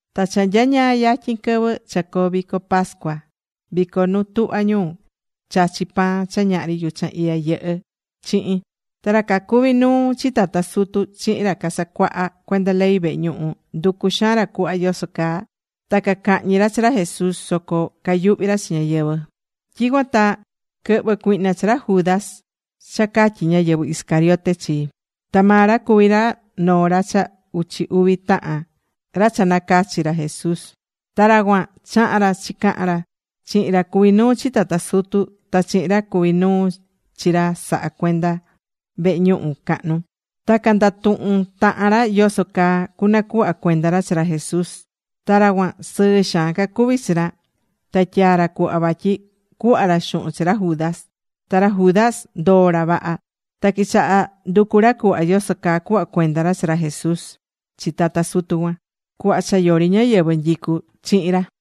Ta cha nyañaa yatyin quɨvɨ cha coo vico pascua vico nu tuhva ñu chachi pan cha ñahri yuchan iya yɨhɨ́ chihin. Ta ra cacuví nuu chi tata sutu chihin ra casacuahá cuenda ley vehe ñuhu, nducú xaan ra cuhva yoso caa ta cacahñi ra chi ra Jesús. Soco cayuhví ra chi ñáyɨvɨ. Tyicuan ta quɨhvɨ̱ cuihna chi ra Judas cha catyí ñáyɨvɨ Iscariote chi. Ta maa ra cuvi noo ra cha uchi uvi tahan ra cha nacachi̱ ra Jesús. Ta ra cuan, chaha̱n ra chi cahan ra chihin ra cuví nuu chi tata sutu, ta chihin ra cuví nuu chi ra sahá cuenda vehe ñuhu cahnu. Ta candatuhu̱n tahan ra yoso caa cunacuhva cuenda ra chi ra Jesús. Ta ra cuan sɨɨ xaan cacuví chi ra. Ta tyaa̱ ra cuhva vatyi cuhva ra xuhun chi ra Judas. Ta ra Judas ndoo ra vaha. Ta quichaha nducu ra cuhva yoso caa cuhva cuenda ra chi ra Jesús chi tata sutu cuan, cuhva cha yori ñáyɨvɨ nyicú chihin ra.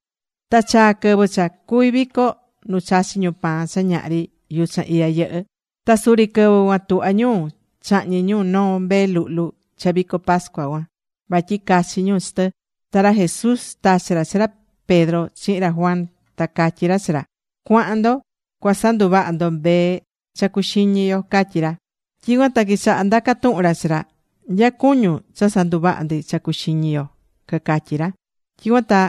Ta chaa̱ quɨvɨ cha cuví vico nu chachí ñu pan cha ñahri yuchan iya yɨhɨ́. Ta suri quɨvɨ cuan tuhvá ñu chahñi ñu noo mbee luhlu cha vico pascua cuan. Vatyi cachi ñu chi tɨ. Ta ra Jesús tachi̱ ra chi ra Pedro chihin ra Juan, ta catyí ra chi ra: ―Cua̱han ndo cua sanduvaha ndo mbee cha cuxiñi yo ―catyí ra. Tyicuan ta quichaha ndaca tuhun ra chi ra: ―¿Nya cuñún cha sanduvaha ndi cha cuxiñi yo? ―cacatyí ra. Tyicuan ta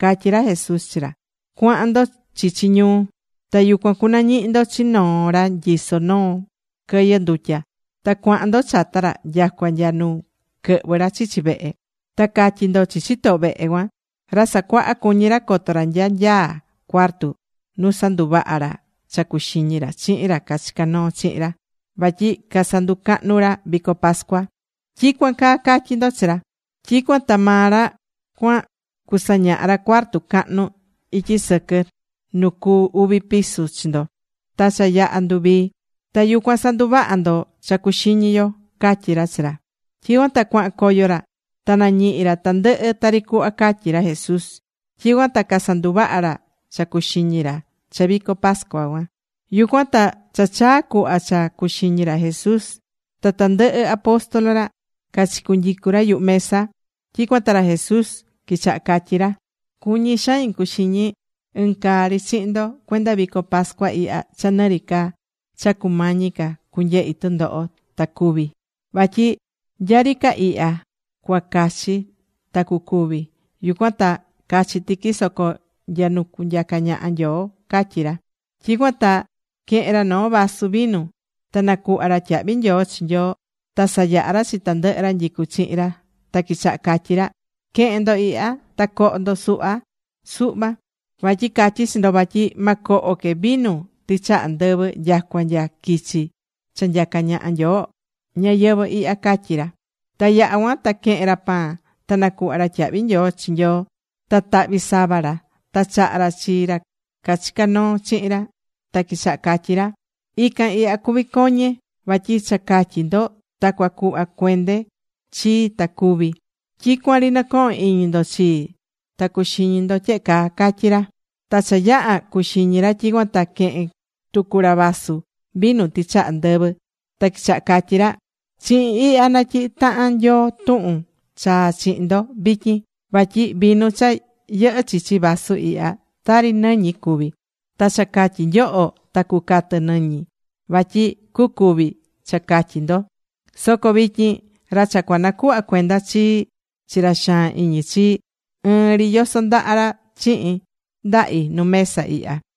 catyí ra Jesús chi ra: ―Cua̱han ndo chichi ñuu. Ta yucuan cunañihi ndo chi noo ra nyisó noo quɨyɨ ndutya. Ta cua̱han ndo chata ra nyacua nya nu quɨhvɨ ra chichi vehe. Ta ca̱tyi ndo chi chitoho vehe cuan: “Ra Sacuaha, cuñí ra coto ra nya nyaá cuartu nu sanduvaha ra cha cuxiñi ra chihin ra cachicá noo chihin ra, vatyi casanducahnu ra vico pascua.” Tyicuan caa ca̱tyi ndo chi ra. Tyicuan ta maa ra cuan cusañaha ra cuartu cahnu ityi sɨquɨ nu cu uvi piso chi ndo. Ta cha yaha̱ nduvii. Ta yucuan sa̱nduvaha ndo cha cuxiñi yo ―catyí ra chi ra. Tyicuan ta cuahan coyo ra. Ta nañihi̱ ra tandɨhɨ tari cuhva catyi̱ ra Jesús. Tyicuan ta casanduvaha̱ ra cha cuxiñi ra cha vico pascua cuan. Yucuan ta cha chaa̱ cuhva cha cuxiñi ra Jesús ta tandɨhɨ apóstol ra, cachicunyicu̱ ra yuhu mesa. Tyicuan ta ra Jesús quichaha catyí ra: ―Cuñí xain cuxiñi ɨn caa ri chihin ndo cuenda vico pascua ihya cha nɨ ri ca cha cumañi ca cunyehi tundoho ta cúvi. Vatyi nya ri ca ihya cua cachi ta cucúvi. Yucuan ta cachi tiqui soco nya nu nyacá ñaha Nyoo ―catyí ra. Tyicuan ta quehe̱n ra noo vasu vinu. Ta nacuhva̱ ra tyiyahvi nyoo chi Nyoo, ta sayaha̱ ra chi tandɨhɨ ra nyicú chihin ra. Ta quichaha catyi ra: ―Que̱hen ndo ihya. Ta co̱ho ndo suhva suhva. Vatyi catyí chi ndo vatyi ma coho que vinu tɨchaha ndɨvɨ nyacua nya quichi cha nyacá ñaha Nyoo ñayɨvɨ̱ ihya ―catyí ra. Ta yaha̱ cuan ta quehe̱n ra pan. Ta nacuhva̱ ra tyahvi nyoo chi Nyoo. Ta tahvi̱ sava ra. Ta chaha̱ ra chi ra cachicá noo chihin ra. Ta quichaha catyí ra: ―Ican ihya cuví coñe. Vatyi cha catyi ndo ta cua cuhva cuende chii ta cúvi. Tyicuan ri nɨ̱cohon iñi ndo chii ta cu̱xiñi ndo tyehe caa ―catyí ra. Ta cha yaha̱ cuxiñi ra, tyicuan ta quehe̱n tucu ra vaso vinu tɨchaha ndɨvɨ, ta quichaha catyí ra: ―Chihin ihya natyihí tahan Nyoo tuhun chaa chihin ndo vityin. Vatyi vinu cha yɨhɨ́ chichi vaso ihya, tari nɨñi cuví. Ta cha catyi nyoho ta cucatɨ nɨñi. Vatyi cucúvi cha catyi ndo. ’Soco vityin, ra cha cua nacuhva cuenda chii chi ra xaan iñi chii, ɨɨn ri yoso ndaha ra chihin ndahi nu mesa ihya.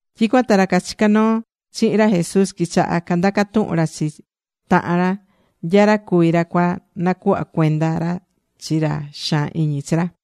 Tyicuan ta ra cachicá noo chihin ra Jesús quichaha candaca tuhun ra chi tahan ra, nya ra cuví ra cua nacuhva cuenda chi ra chi ra xaan iñi chi ra.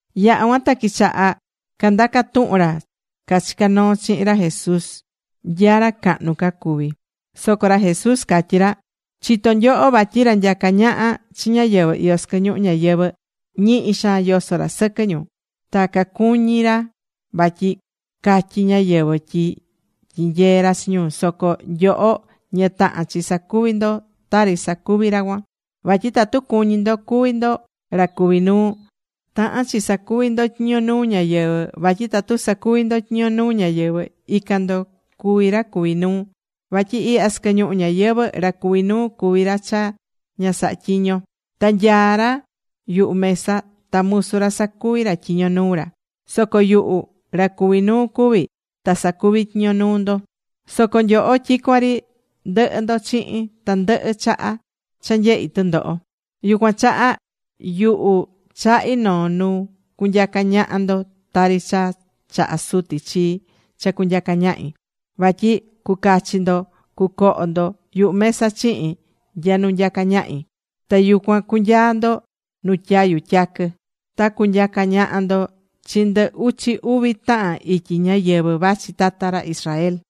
Yaha̱ cuan ta quichaha candatuhun ra cachicá noo chihin ra Jesús nya ra cahnu ca cuví. Soco ra Jesús catyí ra: ―Chitó nyoho vatyi ra nyacá ñaha chi ñáyɨvɨ iyó sɨquɨ ñuhu ñayɨvɨ̱, ñihi xaan yosó ra sɨquɨ ñu. Ta cacuñí ra vatyi catyí ñáyɨvɨ tyi tyinyee ra chi ñu. Soco nyoho ña tahán chi sacuvi ndo tari sacuví ra cuan. Vatyi tatu cuñí ndo cuvi ndo ra cuví nuu, tahán chi sacuvi ndo tyiño nuu ñáyɨvɨ. Vatyi tatu sacuví ndo tyiño nuu ñáyɨvɨ, ican ndo cuví ra cuví nuu. Vatyi ihya sɨquɨ ñuhu ñayɨvɨ̱ ra cuví nuu cuví ra cha ña sahá tyiño. Ta nyaá ra yuhu mesa ta musu ra sacuví ra tyiño nuu ra. Soco yuhu ra cuví nuu cuví, ta sacuví tyiño nuu ndo. ’Soco nyoho tyicuan ri ndɨhɨ ndo chihin, tandɨhɨ chaha cha nyehí tundoho. Yucuan chaha, yuhu chahí noo nu cunyaca ñaha ndo tari cha chaha̱ Suti chii cha cunyaca ñahi. Vatyi cucachi ndo cucoho ndo yuhu mesa chihin nya nu nyacá ñahi. Ta yucuan cunyaa ndo nu tyayu tyaquɨ. Ta cunyaca ñaha ndo chi ndɨ uchi uvi tahan ityi ñáyɨvɨ vachi tata ra Israel.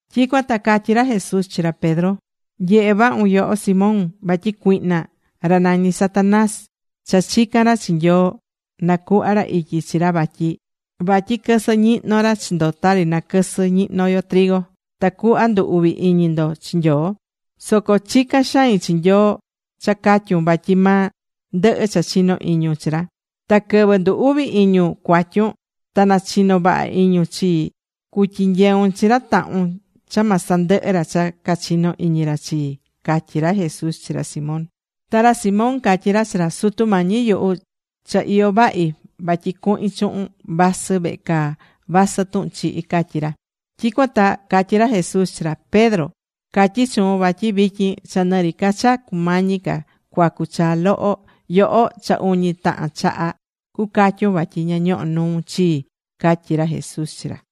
Tyicuan ta catyí ra Jesús chi ra Pedro: ―Nye̱he vahun, yoho Simón. Vatyi cuihna, ra nañí Satanás, cha chica̱n ra chi Nyoo na cuhva ra ityi chi ra vatyi quɨsɨ ñihno ra chi ndo tari naquɨsɨ ñihno yo, tacuhva ndu uvi iñi ndo chi Nyoo. Soco chicán xain chi Nyoo cha catyun, vatyi ma ndɨhɨ cha chinó iñun chi ra. Ta quɨvɨ ndu uvi iñun cuatyun ta na chino vaha iñun chii cutyinyeun chi ra tahun cha ma sandɨhɨ ra cha cachino iñi ra chii ―catyí ra Jesús chi ra Simón. Ta ra Simón catyí ra chi ra: ―Sutu Mañi yuhu, cha iyó vahi vatyi cuhin chuhun vasɨ vehe caa, vasɨ tuhun chihi ―catyí ra. Tyicuan ta catyí ra Jesús chi ra: ―Pedro, catyí chuun vatyi vityin cha nɨ ri ca cha cumañi ca cuacu chaa loho, yoho cha uñi tahan chaha cucatyun vatyi ña ñohó nuun chii ―catyí ra Jesús chi ra.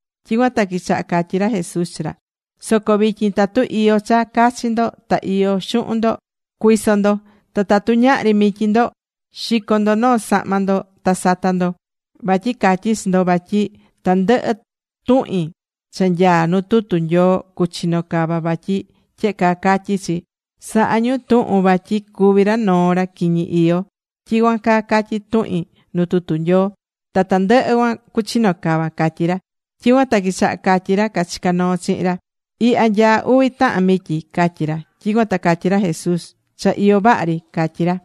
Tyicuan ta quichaha catyí ra Jesús chi ra: ―Soco vityin, tatu iyó cha cachi ndo ta iyó xuhun ndo, cui̱so ndo. Ta tatu ñahri mityi ndo, xi̱co ndo noo sahma ndo ta sa̱ta ndo. Vatyi catyí chi ndo, vatyi tandɨhɨ tuhin cha nyaá nu tutu Nyoo cuchino cava vatyi tyehe caa catyí chi: “Sahá ñu tuhun tyi cuví ra noo ra quiñi iyó.” Tyicuan caa catyí tuhin nu tutu Nyoo. Ta tandɨhɨ cuan cuchino cava ―catyí ra. Tyicuan ta quichaha catyi ra cachicá noo chihin ra: ―Ihya nyaá uvi tahan mityi ―catyí ra. Tyicuan ta catyí ra Jesús: ―Cha iyó vaha ri ―catyí ra.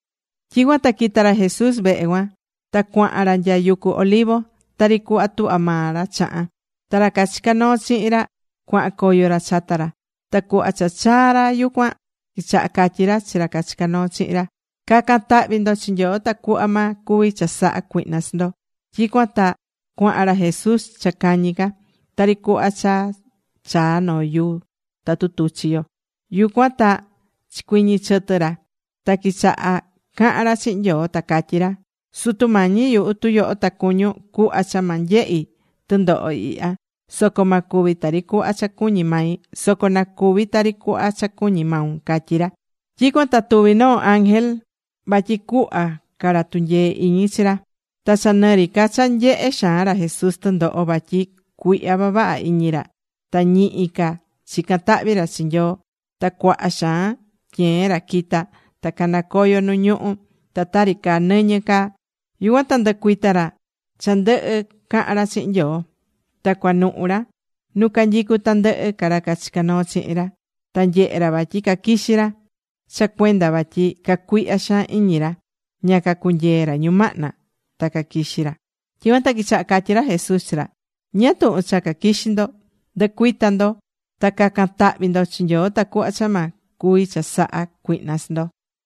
Tyicuan ta quita̱ ra Jesús vehe cuan. Ta cuahan ra nya yucu Olivo. Tari cuhva tuhvá maa ra chahan. Ta ra cachicá noo chihin ra cuahan coyo ra chata ra. Ta cuhva cha chaa ra yucuan, quichaha catyi ra chi ra cachicá noo chihin ra: ―Ca̱can tahvi ndo chi Nyoo tacuhva ma cuvi chasaha cuihna chi ndo. Tyicuan ta cuahan ra Jesús cha cañi ca, tari cuhva cha chaa noo yuu tatu tuchi yo. Yucuan ta chicuɨñɨ chɨtɨ ra. Ta quichaha cahan ra chihin Nyoo, ta catyí ra: ―Sutu Mañi yuhu, tu yoho ta cuñún, cuhva cha ma nyehi tundoho ihya. Soco ma cuvi tari cuhva cha cuñí mai. Soco na cuvi tari cuhva cha cuñí maun ―catyí ra. Tyicuan ta tuvi̱ noo ángel, vatyi cuhva ca ra tunyee iñi chi ra. Ta cha nɨ ri ca cha nyehé xaan ra Jesús tundoho vatyi cuihya vavaha iñi ra, ta ñihi ca chicán tahvi ra chi Nyoo. Ta cuaha xaan tyeen ra quitá ta canacoyó nu ñuhú, ta tari caa nɨñɨ caa. Yucuan ta nducuita̱ ra cha ndɨhɨ̱ cahan ra chihin Nyoo. Ta cuanuhu ra nu canyicu tandɨhɨ ra cachicá noo chihin ra. Ta nyehe̱ ra vatyi caquixí ra, cha cuenda vatyi cacuihya xaan iñi ra, ña cacunyee̱ ra ñumahna ta caquixi ra. Tyicuan ta quichaha catyi ra Jesús chi ra: ―¿Ñáá tuhun cha caquixí ndo? Ndu̱cuita ndo. Ta ca̱can tahvi ndo chi Nyoo, tacuhva cha ma cuvi chasaha cuihna chi ndo.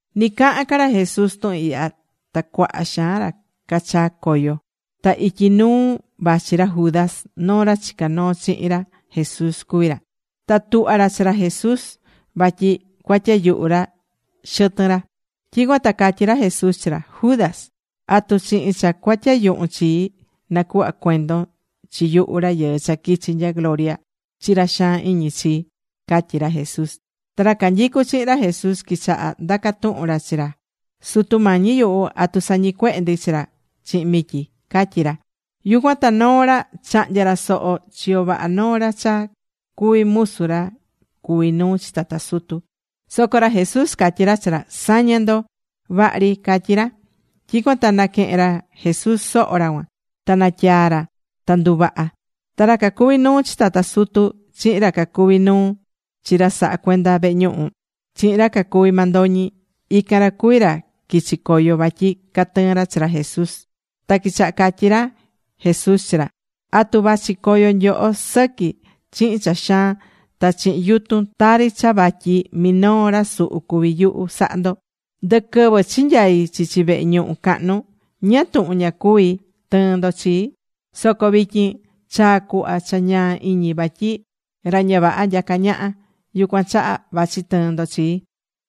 Nɨ cahán ca ra Jesús tuhun ihya, ta cuaha xaan ra cachaa̱ coyo. Ta ityi nuu vachi ra Judas, noo ra chicá noo chihin ra Jesús cuví ra. Ta tuhva̱ ra chi ra Jesús vatyi cua tyayuhu ra xɨtɨn ra. Tyicuan ta catyí ra Jesús chi ra: ―Judas, ¿atu chihin cha cua tyayuhun chii, nacuhvá cuendon chi yuhu, Rayɨɨ cha quichi nya gloria, chi ra xaan iñi chii? ―catyí ra Jesús. Ta ra canyicú chihin ra Jesús quichaha ndaca tuhun ra chi ra: ―Sutu Mañi yuhu, ¿atu sañicuehe ndi chi ra chihin mityi? ―catyí ra. Yucuan ta noo ra, chahnya̱ ra soho chiyo vaha noo ra cha cuví musu ra cuví nuu chi tata sutu. Soco ra Jesús catyí ra chi ra: ―Sa̱ña ndo. Vaha ri ―catyí ra. Tyicuan ta naquehe̱n ra Jesús soho ra cuan. Ta natyaa̱ ra, ta nduvaha̱. Ta ra cacuví nuu chi tata sutu chihin ra cacuví nuu chi ra sahá cuenda vehe ñuhu, chihin ra cacuví mandoñi, ican ra cuví ra quichi coyo vatyi catɨɨn ra chi ra Jesús. Ta quichaha catyí ra Jesús chi ra: ―¿Atu vachi coyo nyoho sɨqui chihin cha xaan ta chihin yutun tari cha vatyi minoo ra suhu cuví yuhu sahá ndo? Ndɨquɨvɨ chinyai̱ chichi vehe ñuhu cahnu, ¿ñáá tuhun ña cuví tɨɨn ndo chii? Soco vityin chaa̱ cuhva cha ñaa iñi vatyi ra ña vaha nyacá ñaha. Yucuan chaha vachi tɨɨn ndo chii.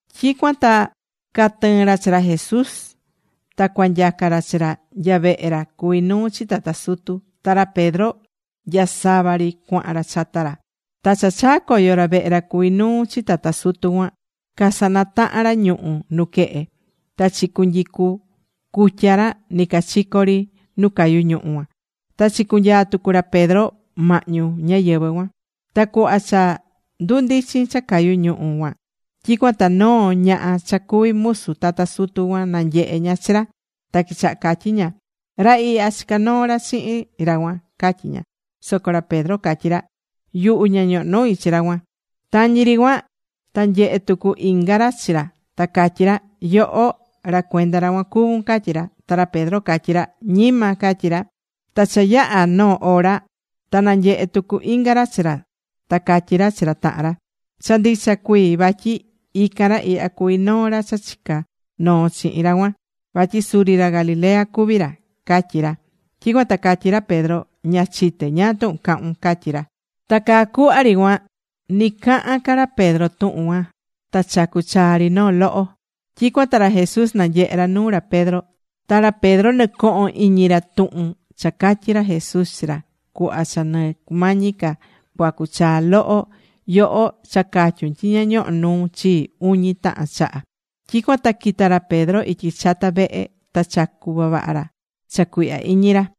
Tyicuan ta catɨɨn ra chi ra Jesús. Ta cua nyaca ra chi ra nya vehe ra cuví nuu chi tata sutu. Ta ra Pedro nyasava ri cuahan ra chata ra. Ta cha chaa̱ coyo ra vehe ra cuví nuu chi tata sutu cuan, casanataha̱n ra ñuhu̱ nuquehe. Ta chicunyicú cutya ra nɨcachico ri nu cayú ñuhu̱ cuan. Ta chicunyaa̱ tucu ra Pedro mahñu ñáyɨvɨ cuan. Ta cuhva cha ndundichin cha cayu ñuhu̱ cuan, tyicuan ta noo ñaha cha cuví musu tata sutu cuan nanyehe̱ ña chi ra. Ta quichaha catyí ña: ―Ra ihya chicá noo ra chihin ra cuan ―catyí ña. Soco ra Pedro catyí ra: ―Yuhu ña ñohó nui chi ra cuan. Tañi ri cuan ta nyehe̱ tucu inga ra chi ra, ta catyí ra: ―Yoho, ra cuenda ra cuan cuvún ―catyí ra. Ta ra Pedro catyí ra: ―Ñima ―catyí ra. Ta cha yaha̱ noo ora, ta nanyehe̱ tucu inga ra chi ra ta catyí ra chi ra tahan ra: ―Cha ndicha cuii vatyi ican ra ihya cuví noo ra cha chicá noo chihin ra cuan. Vatyi suri ra Galilea cuví ra ―catyí ra. Tyicuan ta catyí ra Pedro: ―Ña chité ñáá tuhun cahún ―catyí ra. Ta caa cuhva ri cuan, nɨ cahán ca ra Pedro tuhun cuan, ta chacu̱ chaa ri noo loho. Tyicuan ta ra Jesús nanyehe̱ ra nuu ra Pedro. Ta ra Pedro nɨcoho̱n iñi ra tuhun cha catyi̱ ra Jesús chi ra: “Cuhva cha nɨ cumañi ca cuacu chaa loho, yoho cha catyun tyi ña ñohó nuun chii uñi tahan chaha.” Tyicuan ta quita̱ ra Pedro ityi chata vehe. Ta chacu̱ vavaha ra cha cuihya iñi ra.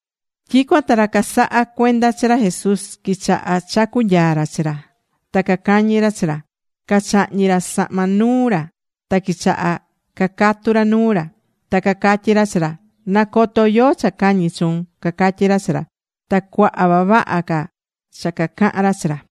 Tyicuan ta ra casahá cuenda chi ra Jesús, quichaha chacu nyaa ra chi ra. Ta cacañí ra chi ra. Cachahñi̱ ra sahma nuu ra, ta quichaha cacatu ra nuu ra. Ta cacatyí ra chi ra: ―Na̱coto yóó cha cañí chuun ―cacatyí ra chi ra. Ta cuaha vavaha ca cha cacahan ra chi ra.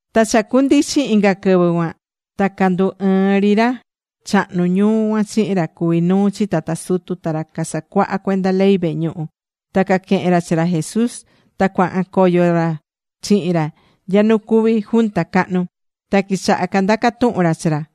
Ta cha cundichi̱n inga quɨvɨ cuan. Ta candu ɨɨ̱n ri ra chahnu ñuu cuan chihin ra cuví nuu chi tata sutu, ta ra casacuahá cuenda ley vehe ñuhu. Ta caquehe̱n ra chi ra Jesús. Ta cuahan coyo ra chihin ra nya nu cuví junta cahnu. Ta quichaha candaca tuhun ra chi ra: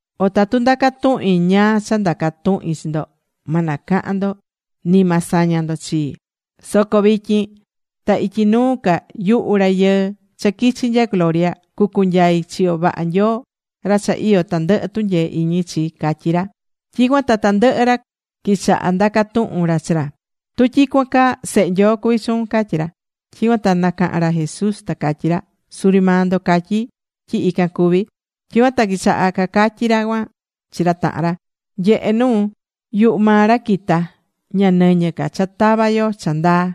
O tatu ndaca tuhin ñáá cha ndaca tuhin chi ndo, ma nacahan ndo ni ma saña ndo chii. Soco vityin ta ityi nuu ca yuhu Rayɨɨ cha quichi nya gloria cucunyai chiyo vaha Nyoo ra cha iyó tandɨhɨ tunyee iñi chi ―catyí ra. Tyicuan ta tandɨhɨ ra quichaha ndaca tuhun ra chi ra: ―Tu tyicuan caa, Sehe Nyoo cuví chuun ―catyí ra. Tyicuan ta nacahan ra Jesús ta catyí ra: ―Suri maa ndo catyí tyi ican cuví. Tyicuan ta quichaha cacatyí ra cuan chi ra tahan ra: ―Nyehe nuu. Yuhu maa ra quita̱. Ña nɨñɨ ca cha tava yo cha ndaa.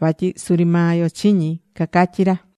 Vatyi suri maa yo chiñi̱ ―cacatyí ra.